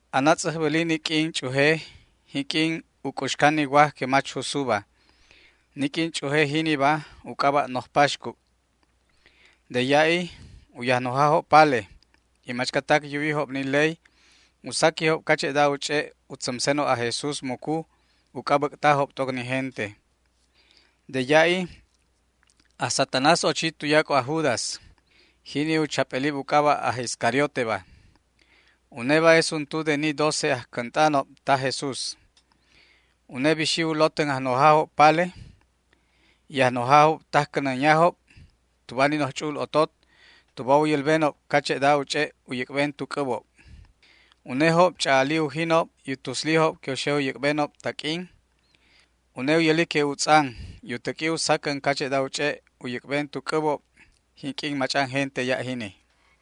Anatz'äjbäli ni q'uin ch'uje jinq'uin u c'uxcan ni waj que mach jusuba. Ni q'uin ch'uje jiniba u c'aba' Noj Paxcu'. De ya'i u yajnojajob pale y machcatac yuwijob ni ley u saquijob cache'da u ch'e' u tzämsenob aj Jesús mucu uc'a bäc'tajob t'oc ni gente. De ya'i aj Satanás ochi tuyac'o aj Judas, jini u chap'elib u c'aba' aj Iscarioteba. Uneba es untu de ni doce ajcänt'anob taj Jesús. Une bixi u lotän ajnojajob pale y ajnojajob tajcänänyajob tuba ni noj ch'u'ul otot cache'da u ch'e' u yäc'ben tu c'äbob. Unejob ch'a'ali ujinob y u tuslijob que u xe u yäc'benob taq'uin. Une u yäli que utz'an y u täq'ui u sacän cache'da u ch'e' u yäc'ben tu c'äbob jinq'uin mach'an gente ya' jini.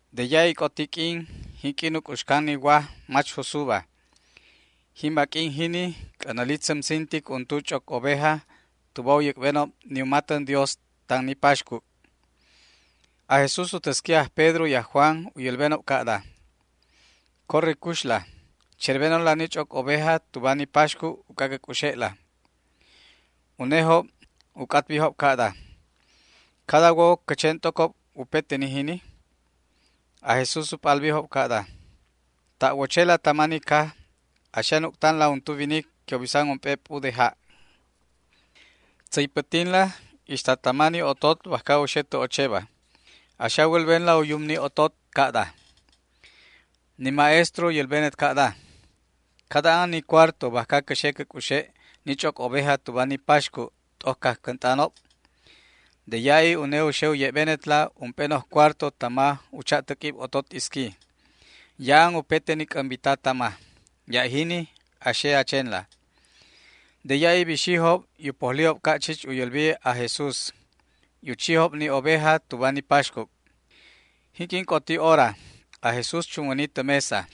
De ya'i c'oti q'uin jinq'uin u c'uxcan ni waj mach jusuba. Jimba q'uin jini c'änäli tzämsintic untu ch'oc oveja tuba u yäc'benob ni u matän Dios tan ni paxcu'. Aj Jesús u täsqui aj Pedro y aj Juan u yälbenob ca'da: ―Corre cuxla, cherbenonla ni ch'oc oveja tuba ni paxcu' uc'a cä c'uxe'la. Unejob u c'atbijob ca'da: ―¿Cada a wo cä chen t'ocob upete ni jini? Aj Jesús u p'albijob ca'da: ―Ta' wochela tama ni caj a xe a nuc'tanla untu winic que u bisan ump'e p'u de ja'. Tzäypätinla ixta tama ni otot bajca u xe tä ocheba. A xe a wälbenla u yum ni otot ca'da: “Ni Maestro u yälbenet ca'da: ¿Cada an ni cuarto bajca cä xe cä c'uxe' ni ch'oc oveja tuba ni paxcu' t'oc cajcänt'anob?” De ya'i une u xe u ye'benetla ump'e noj cuarto tama u cha'täq'uib otot isqui. Ya'an upete ni c'ämbita tama. Ya' jini a xe a chenla. De ya'i bixijob y u pojlijob ca' chich u yälbijob aj Jesús, y u chijob ni oveja tuba ni paxcu'. Jinq'uin c'oti hora, aj Jesús chunwäni tä mesa.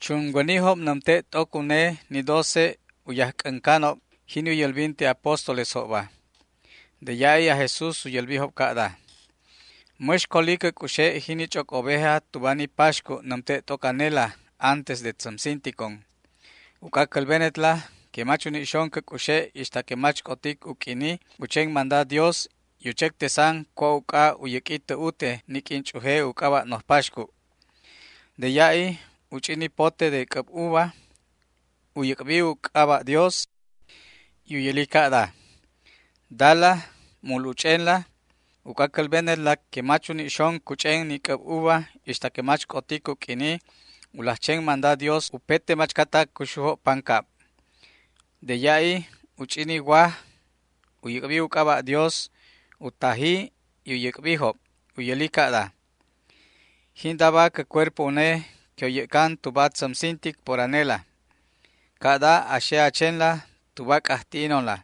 Chunwänijob nämte' t'oc une ni doce ajc'äncanob, jini u yälbinte apóstolesjobba. De ya'i aj Jesús u yälbijob ca'da: ―¡Mäx coli cä c'uxe' jini ch'oc oveja tuba ni paxcu' nämte' t'oc anela antes de tzämsinticon! Uc'a cälbenetla que mach uni' xon cä c'uxe' ixta que mach c'otic u q'uini u chen manda Dios y u chectesan cua' uc'a u yäq'ui tä ute ni q'uin ch'uje u c'aba' Noj Paxcu'. De ya'i u ch'i ni pote de c'äb uva, u yäc'bi u c'aba' Dios y u yäli ca'da: ―Dala, mul uch'enla. Uc'a cälbenetla que mach uni' xon cuch'en ni c'äb uva ixta que mach c'otic u q'uini u laj chen manda Dios upete machcatac cuxujob pancab. De ya'i u ch'i ni waj, u yäc'bi u c'aba' Dios, u taji y u yäc'bijob. U yäli ca'da: ―Jindaba cä cuerpo une que u yäc'can tuba tzämsintic por anela. Ca'da a xe a chenla tuba a c'ajti'inonla.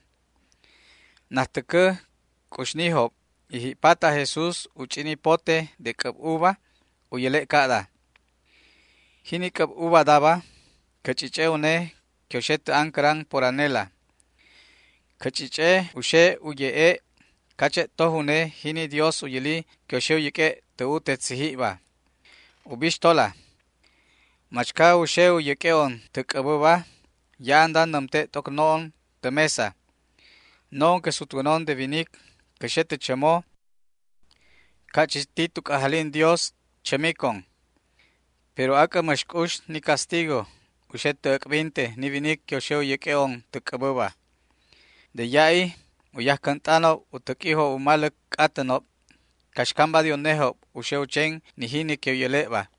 Najtäcä c'uxnijob y ji'pat aj Jesús u ch'i ni pote de c'äb uva täcä u yäle' ca'da: ―Jini c'äb uvadaba cä ch'ich'e une que u xe tä ancäran por anela. Cä ch'ich'e u xe u ye'e' cache' toj une jini Dios u yäli que u xe u yäq'ue' tä ute tzijibba. ’Ubixtola, machca u xe u yäq'ue'on tä c'äbäba ya'anda nämte' t'oc no'on tä mesa. No'on que sutwänon de winic cä xe tä chämo ca' chich ti tu c'ajalin Dios chämicon; pero ¡ac'ä mäx c'ux ni castigo u xe tä äc'binte ni winic que u xe u yäq'ue'on tä c'äbäba! De ya'i u yajcänt'anob u täq'uijob u maläc c'atänob caxcamba de unejob u xe u chen ni jini que u yäle'ba.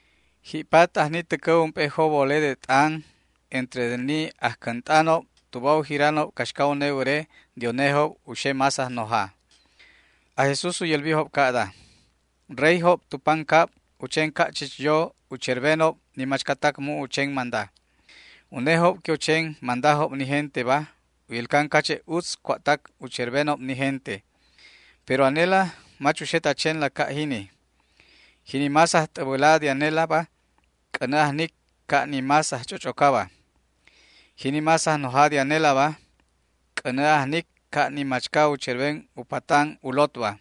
Ji'pat ajni täcä ump'e jobole de t'an entre de ni ajcänt'anob tuba u jiranob caxca une wäre de unejob u xe más ajnoja. Aj Jesús u yälbijob ca'da: ―Reyjob tu pancab u chen ca' chich yo u cherbenob ni machcatac mu' u chen manda. Unejob que u chen mandajob ni genteba u yälcan cache' utz cua'tac u cherbenob ni gente. Pero anela mach uxet a chenla ca' jini. Jini más ajt'äbäla de anelaba c'änä ajnic ca' ni más ajch'och'ocaba. Jini más ajnoja de anelaba c'änä ajnic ca' ni machca u cherben u patan u lotba.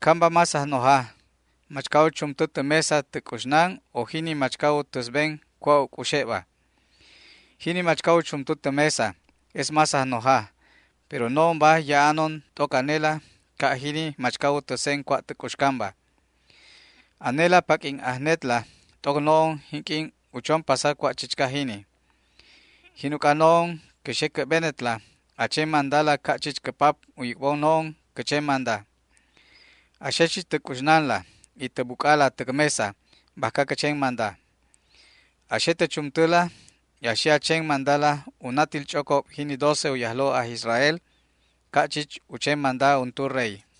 ¿Camba más ajnoja, machca u chumtä tä mesa tä c'uxnan, o jini machca u täsben cua' u c'uxe'ba? Jini machca u chumtä tä mesa es más ajnoja, pero no'onba ya'anon t'oc anela ca' jini machca u täsen cua' tä c'uxcanba. ’Anelaba paq'uin ajnetla t'oc no'on jinq'uin u chon pasa cua' chichca jini. Jin uc'a no'on cä xe cä'benetla a chen mandala ca' chich cä Pap u yäc'bon no'on cä chen manda. A xe chich tä c'uxnanla y tä buc'ala täc mesa bajca cä chen manda. A xe tä chumtäla y a xe a chen mandala u natil ch'ocob jini doce u yajlo' aj Israel ca' chich u chen manda untu rey.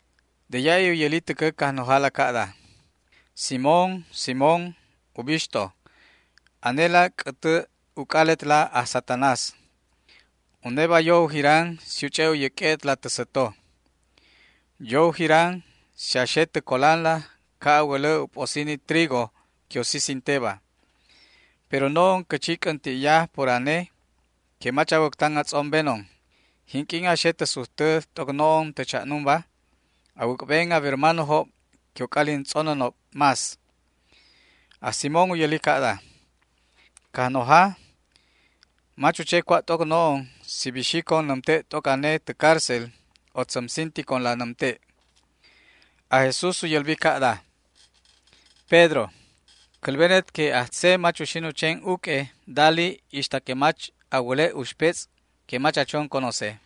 De ya'i u yäli täcä Cajnojala ca'da: ―Simón, Simón, ubixto, anela c'ätä uc'aletla aj Satanás. Uneba yo u jiran si u ch'e' u yäq'ue'etla tä säto. Yo u jiran si a xe tä colanla ca' a wälä u p'osi ni trigo que u sisinteba. Pero no'on cä chi c'änti'ya por ane que mach a wäctan a tz'ombenon. Jinq'uin a xe tä sujtä t'oc no'on tä cha'numba, a wäc'ben a wermanojob que u c'alin tz'onänob más. Aj Simón u yälbi ca'da: ―Cajnoja, mach u che cua' t'oc no'on si bixicon nämte' t'oc ane tä cárcel o tzämsinticonla nämte'. Aj Jesús u yälbi ca'da: ―Pedro, cälbenet que ajtze mach uxin u chen uq'ue dali ixta que mach a wäle' uxpetz' que mach a chon conoce.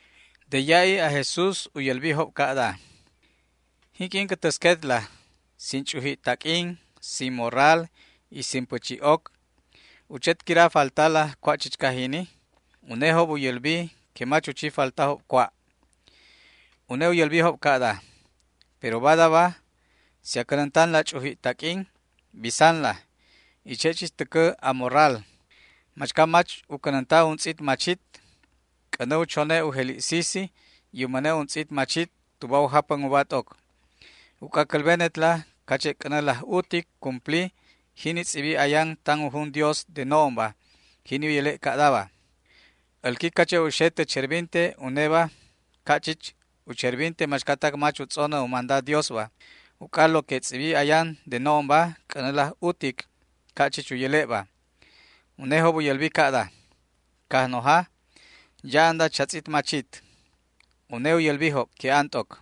De ya'i aj Jesús u yälbijob ca'da: ―Jinq'uin cä täsquetla sin ch'uji' taq'uin, sin morral y sin pächi'oc, ¿u chet quira faltala cua' chichca jini? Unejob u yälbi que mach u chi faltajob cua'. Une u yälbijob ca'da: ―Pero badaba si a cänäntanla ch'uji' taq'uinba bisanla, y che' chich täcä a morral. Machca mach u cänänta untz'it machitba c'änä u chone' u jeli' sisi y u mäne' untz'it machit tuba u japän uba t'oc. Uc'a cälbenetla cache' c'änä laj utic cumpli jini tz'ibi ayan tan u jun Dios de no'onba, jini u yäle' ca'daba: “Älqui cache' u xe tä cherbinte uneba ca' chich u cherbinte machcatac mach u tz'onä u manda Diosba”, uc'a lo que tz'ibi ayan de no'onba c'änä laj utic ca' chich u yäle'ba. Unejob u yälbi ca'da: ―Cajnoja, ya'anda chatz'it machit. Une u yälbijob que an t'oc.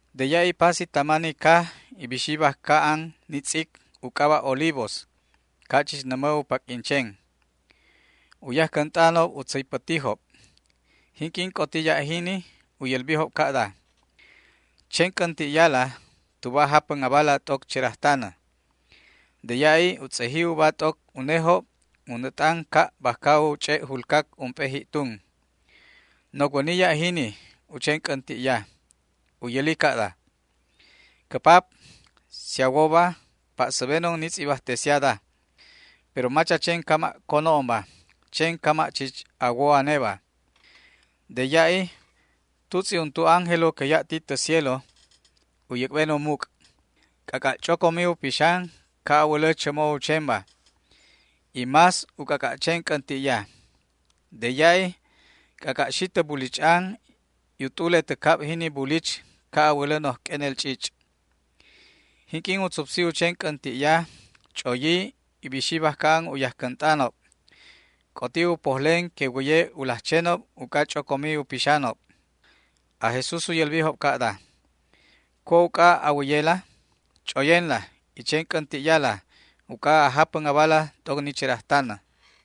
De ya'i pasi tama ni caj y bixi bajca an ni tz'ic u c'aba' Olivos, ca' chich nämä u paq'uin chenba. U yajcänt'anob u tzäypätijob. Jinq'uin c'oti ya' jini u yälbijob ca'da: ―Chen c'änti'yala tuba a japän abala t'oc cherajtanä. De ya'i u tz'eji uba t'oc unejob u nät'an ca' bajca u ch'e' julcac ump'e ji'tun. Nocwäni ya' jini u chen c'änti'ya. U yäli ca'da: ―Cä Pap, si a woba, pa'säbenon ni tz'ibajtesiada, pero mach a chen cama' co no'onba, chen cama' chich a wo aneba. De ya'i tutz'i untu ángelo que ya' ti tä cielo u yäc'ben u muc'. C'ac'a' ch'ocomi u pixan, ca' a wälä chämo u chenba, y más u c'ac'a' chen c'änti'ya. De ya'i c'ac'a' xi tä bulich'an y u t'ule tä cab jini bulich ca' a wälä noj q'uenel ch'ich'. Jinq'uin u tzupsi u chen c'änti'ya, ch'oyi y bixi bajca an u yajcänt'anob. C'oti u pojlen que wäye u laj chenob uc'a ch'ocomi u pixanob. Aj Jesús u yälbijob ca'da: ―¿Cua' uc'a a wäyela? Ch'oyenla y chen c'änti'yala uc'a a japän abala t'oc ni cherajtanä.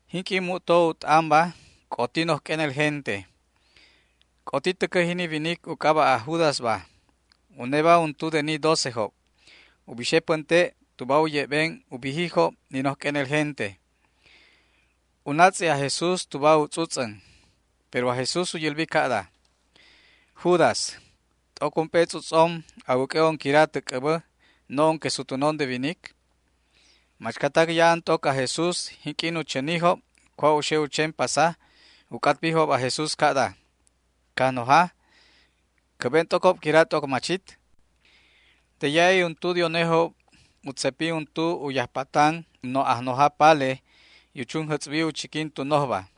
Jinq'uin mu'to u t'anba c'oti noj q'uenel gente. C'oti täcä jini winic u c'aba' aj Judasba, uneba untu de ni docejob, u bixe pänte' tuba u ye'ben u bijijob ni noj q'uenel gente. U natz'i aj Jesús tuba u tz'utz'än. Pero aj Jesús u yälbi ca'da: ―Judas, ¿t'oc ump'e tz'utz'om a wäq'ue'on quira tä c'äbä, no'on que sutwänon de winic? Machcatac ya'an t'oc aj Jesús, jinq'uin u chänijob cua' u xe u chen pasaba u c'atbijob aj Jesús ca'da: ―Cajnoja, ¿cä'ben t'ocob quira t'oc machit? De ya'i untu de unejob u tzepi untu u yajpatan u noj ajnoja pale y u chunjätz'bi u chiquin tu nojba.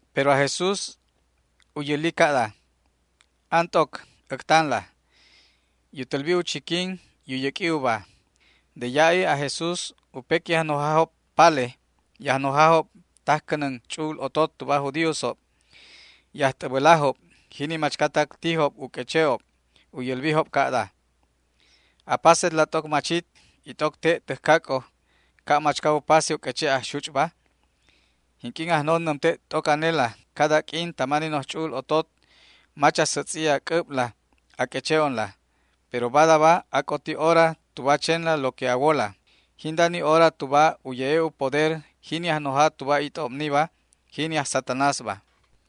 Pero aj Jesús u yäli ca'da: ―An t'oc, äctanla. Y u tälbi u chiquin y u yäq'ui uba. De ya'i aj Jesús u pequi ajnojajob pale y ajnojajob tajcänän ch'u'ul otot tuba aj judíosob y ajt'äbälajob, jini machcatac tijob u q'ueche'ob. U yälbijob ca'da: ―¿Apasetla t'oc machit y t'oc te' täjcac'o ca' machca u pase u q'ueche' ajxuch'ba? Jinq'uin ajnon nämte' t'oc anela cada q'uin tama ni noj ch'u'ul otot mach a sätz'i a c'äbla a q'ueche'onla. Pero badaba c'oti hora tuba a chenla lo que a wola. Jinda ni hora tuba u ye'e' u poder jini ajnoja tuba it'obniba, jini aj Satanásba.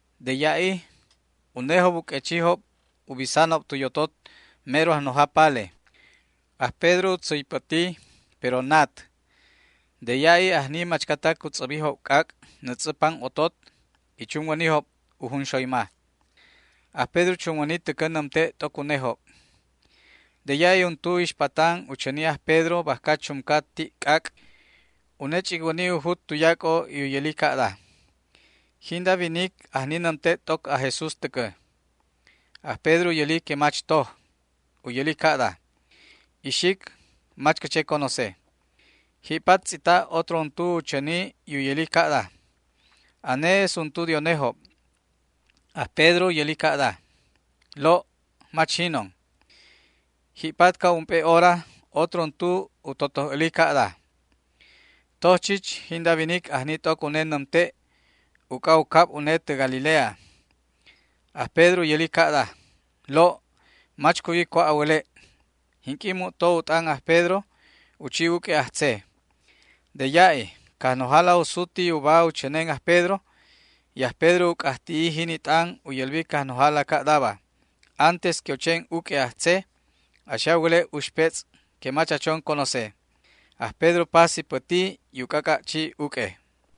De ya'i unejob u q'uechijob u bisanob tu yotot mero ajnoja palejob. Aj Pedro u tzäypäti, pero nat. De ya'i ajni machcatac u tz'äbijob c'ac' nätz'ä pan otot y chunwänijob u junxoyma. Aj Pedro chunwäni täcä nämte' t'oc unejob. De ya'i untu ixpatan u chäni aj Pedro bajca chumca ti' c'ac'. Une ch'icwäni u jut tuyac'o y u yäli ca'da: ―Jinda winic ajni nämte' t'oc aj Jesús täcä. Aj Pedro u yäli que mach toj. U yäli ca'da: ―Ixic, mach cä che conoce. Ji'pat tz'ita' otro untu u chäni y u yäli ca'da: ―Ane es untu de unejob. Aj Pedro u yäli ca'da: ―Lo', mach jinon. Ji'pat ca' ump'e hora, otro untu u totoj äli ca'da: ―Toj chich, jinda winic ajni t'oc une nämte', uc'a u cab une tä Galilea. Aj Pedro u yäli ca'da: ―Lo', mach cuwi cua' a wäle'. Jinq'uin mu'to u t'an aj Pedro, u chi uq'ue ajtze. De ya'i Cajnojala u suti uba u chänen aj Pedro, y aj Pedro u c'ajti'i jini t'an u yälbi Cajnojala ca'daba: “Antes que u chen uq'ue ajtze a xe a wäle' uxpetz' que mach a chon conoce”. Aj Pedro pasi päti y u c'ac'a' chi uq'ue.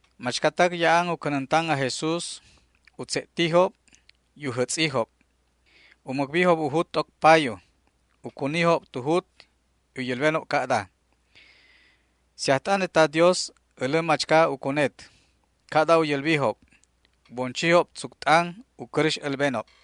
Machcatac ya'an u cänäntan aj Jesús u tze'tijob y u jätz'ijob. U mäcbijob u jut t'oc payu, u cunijob tu jut y u yälbenob ca'da: ―Si ajt'anet ta Dios älä machca u cunet. Ca'da u yälbijob. U bon chijob tzuc t'an u cäräx älbenob.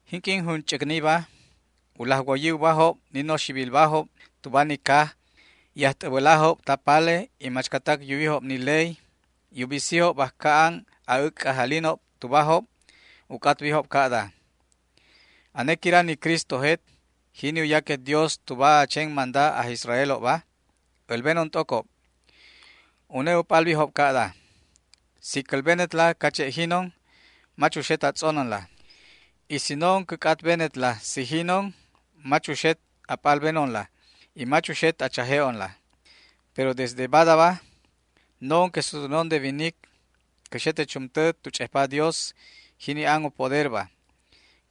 Jinq'uin junch'äcniba u laj woyi ubajob ni noxibilbajob tuba ni caj y ajt'äbälajob ta pale y machcatac yuwijob ni ley y u bisijob bajca an a'äc'c'ajalinob tubajob. U c'atbijob ca'da: ―¿Ane quira ni Cristojet, jini u yaquet Dios tuba a chen manda aj Israelobba? älbenon t'ocob. Une u p'albijob ca'da: ―Si cälbenetla cache' jinon mach uxet a tz'onänla. Y si no'on cä c'atbenetla si jinonba, mach uxet a p'albenonla y mach uxet a chaje'onla. Pero desde badaba no'on que sutwänon de winic cä xe tä chumtä tu ch'ejpa Dios, jini an u poderba.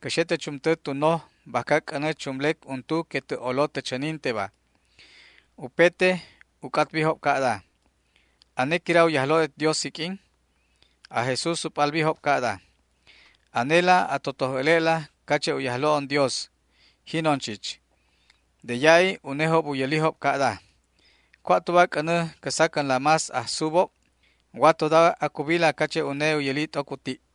Cä xe tä chumtä tu noj bajca c'änä chumlec untu que tä' olo tä chäninteba. Upete u c'atbijob ca'da: ―¿Ane quira u Yajlo'et Dios jiq'uin? Aj Jesús u p'albijob ca'da: ―Anela a totoj äle'la cache' u Yajlo'on Dios. Jinon chich. De ya'i unejob u yälijob ca'da: ―¿Cua' tuba c'änä cä sacänla más ajsubob? Watoda acubila cache' une u yäli t'oc u ti'.